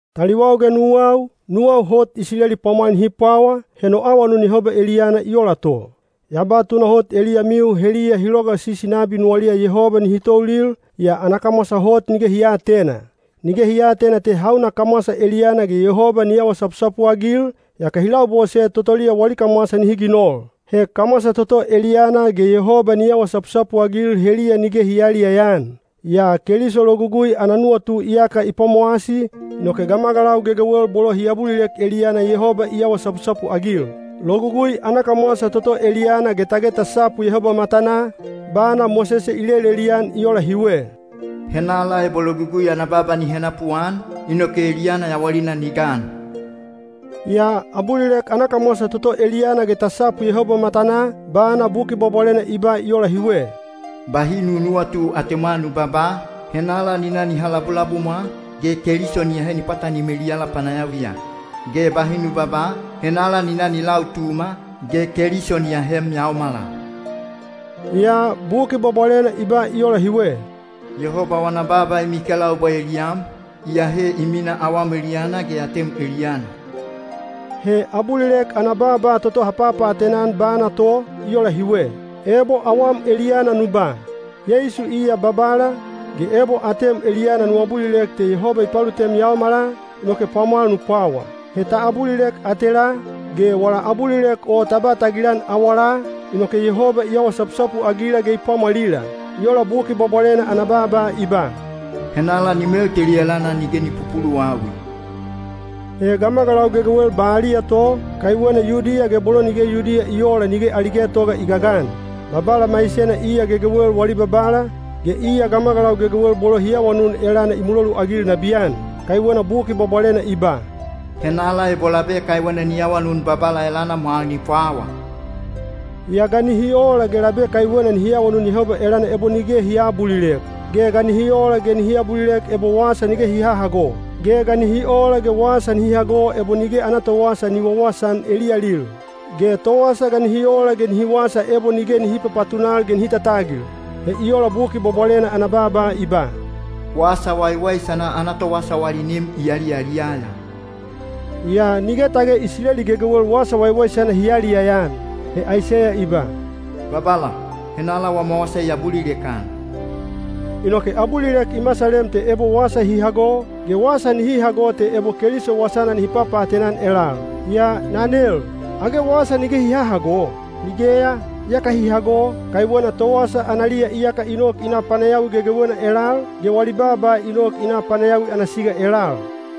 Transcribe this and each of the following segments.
Taliwau ge nuwau, nuwau hot Isileli pwamwal nihi pwawa, he no awanun Yehoba eliyana i ola to. Ya ba tunahot eliyamiu heliya hi logasisi nabi nuwaliya Yehoba nihi toulil, yaa ana kamwasa hot nige hi aatena. Nige hi aatena te hauna kamwasa eliyana ge Yehoba ni awa sapusapu-agil, yaka hi labose totoliya wali kamwasa nihi ginol. He kamwasa toto eliyana ge Yehoba ni awa sapusapu-agil heliya nige hi yaliyaya-an. Yaa Keliso Logugui ana nuwatu iyaka i pwamowasi, inoke gamagalau gegewel bolo hi abulilek eliyana Yehoba i awa sapusapu-agil. Logugui ana kamwasa toto eliyana ge tage ta sapu Yehoba matanaa, bana Mosese i lelelian i ola hiwe: “Henala ebo Logugui ana baaba ni henapuan, inoke eliyana yawalina ni gan.” Yaa abulilek ana kamwasa toto eliyana ge ta sapu Yehoba matanaa, bana Buki Bwabwalena i ba i ola hiwe. “Bahi nu nuwatu atemwa nu babaa, Henala ni na ni ha labulabumwa,” (ge Keliso ni ahe ni pwatanim eliyala panayawiya)? “Ge bahi nu babaa, Henala ni na ni lau Tuma,” (ge Keliso ni ahem yaomala)? Yaa Buki Bwabwalena i ba i ola hiwe: “Yehoba wana baaba i mikelaubwa eliyam, iyahe i mina awam eliyana ge atem eliyana.” He abulilek ana baaba toto ha papaatena-an bana to, i ola hiwe: ebo awam eliyana nu ba, “Yeisu iya Babala,” ge ebo atem eliyana nu abulilek te Yehoba i palutem yaomala, inoke pwamwal nu pwawa. He ta abulilek atelaa, ge wala abulilek o ta ba tagilan awalaa, inoke Yehoba i awa sapusapu-agila ge i pwamwalila. I ola Buki Bwabwalena ana baaba i ba, “Henala ni melteli elana nige ni pupuluwawi.” He gamagalau gegewel baliya to, kaiwena Yudiya ge bolo nige Yudiya i oola nige ali getoga i gagan. Babala maisena iya gegewel wali Babala, ge iya gamagalau gegewel bolo hi awanun elana i muloluagil nabiyan. Kaiwena Buki Bwabwalena i ba, “Henala ebo labe kaiwena ni awanun Babala elana mwal ni pwawa.” Yaa ga nihi ola ge labe kaiwena nihi awanun Yehoba elana ebo nige hi aabulilek? Ge ga nihi ola ge nihi abulilek ebo wasa nige hi hahago? Ge ga nihi ola ge wasa nihi hago ebo nige ana towasa ni wawasaan eliyalil? Ge towasa ga nihi ola ge nihi wasa ebo nige nihi papatunal ge nihi tatagil? He i ola Buki Bwabwalena ana baaba i ba, “Wasa waiwaisana ana towasa wali nem i yaliyaliyaya.” Yaa nige tage Isileli gegewel wasa waiwaisana hi yaliyaya-an. He Aiseya i ba, “Babala, henala wama wasa i abulilek-an?” Inoke abulilek i masalem te ebo wasa hi hago, ge wasa nihi hago te ebo Keliso wasana nihi papaatena-an elal. Yaa na nel, “Age wasa nige hi hahago?” Nigeya, iyaka hi hago, kaiwena towasa “analiya iyaka i nok i na panayawi gegewena elal, ge wali baaba i nok i na panayawi ana siga elal.”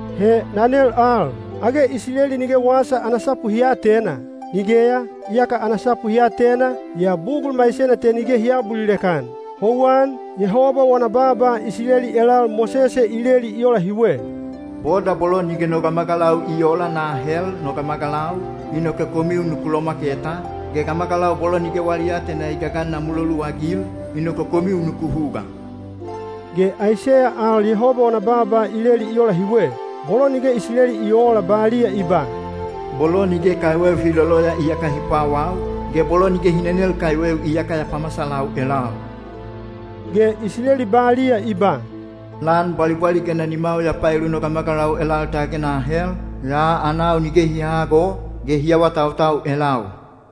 He na nel al, “Age Isileli nige wasa ana sapu hi aatena?” Nigeya, iyaka ana sapu hi atena, yaa bugul maisena te nige hi aabulilek-an. Houwan, Yehoba wana baaba Isileli elal Mosese i leli i ola hiwe: Boda bolo nige no gamagalau i oola na ahel no gamagalau, inoke komiu nuku lomwaketa, ge gamagalau bolo nige wali aatena i gagan na muloluagil, inoke komiu nuku huga. Ge Aiseya al Yehoba wana baaba i leli i ola hiwe. Bolo nige Isileli i oola baliya i ba: Bolo nige kaiweu hi loloya iyaka hi pwawau, ge bolo nige hi nenel kaiweu iyaka ya pamasalau elal. Ge Isileli baliya i ba, “Lan bwalibwaligena nimwau ya paelu no gamagalau elal tage na ahel, yaa anau nige hi hahago, ge hi awatautau elau.”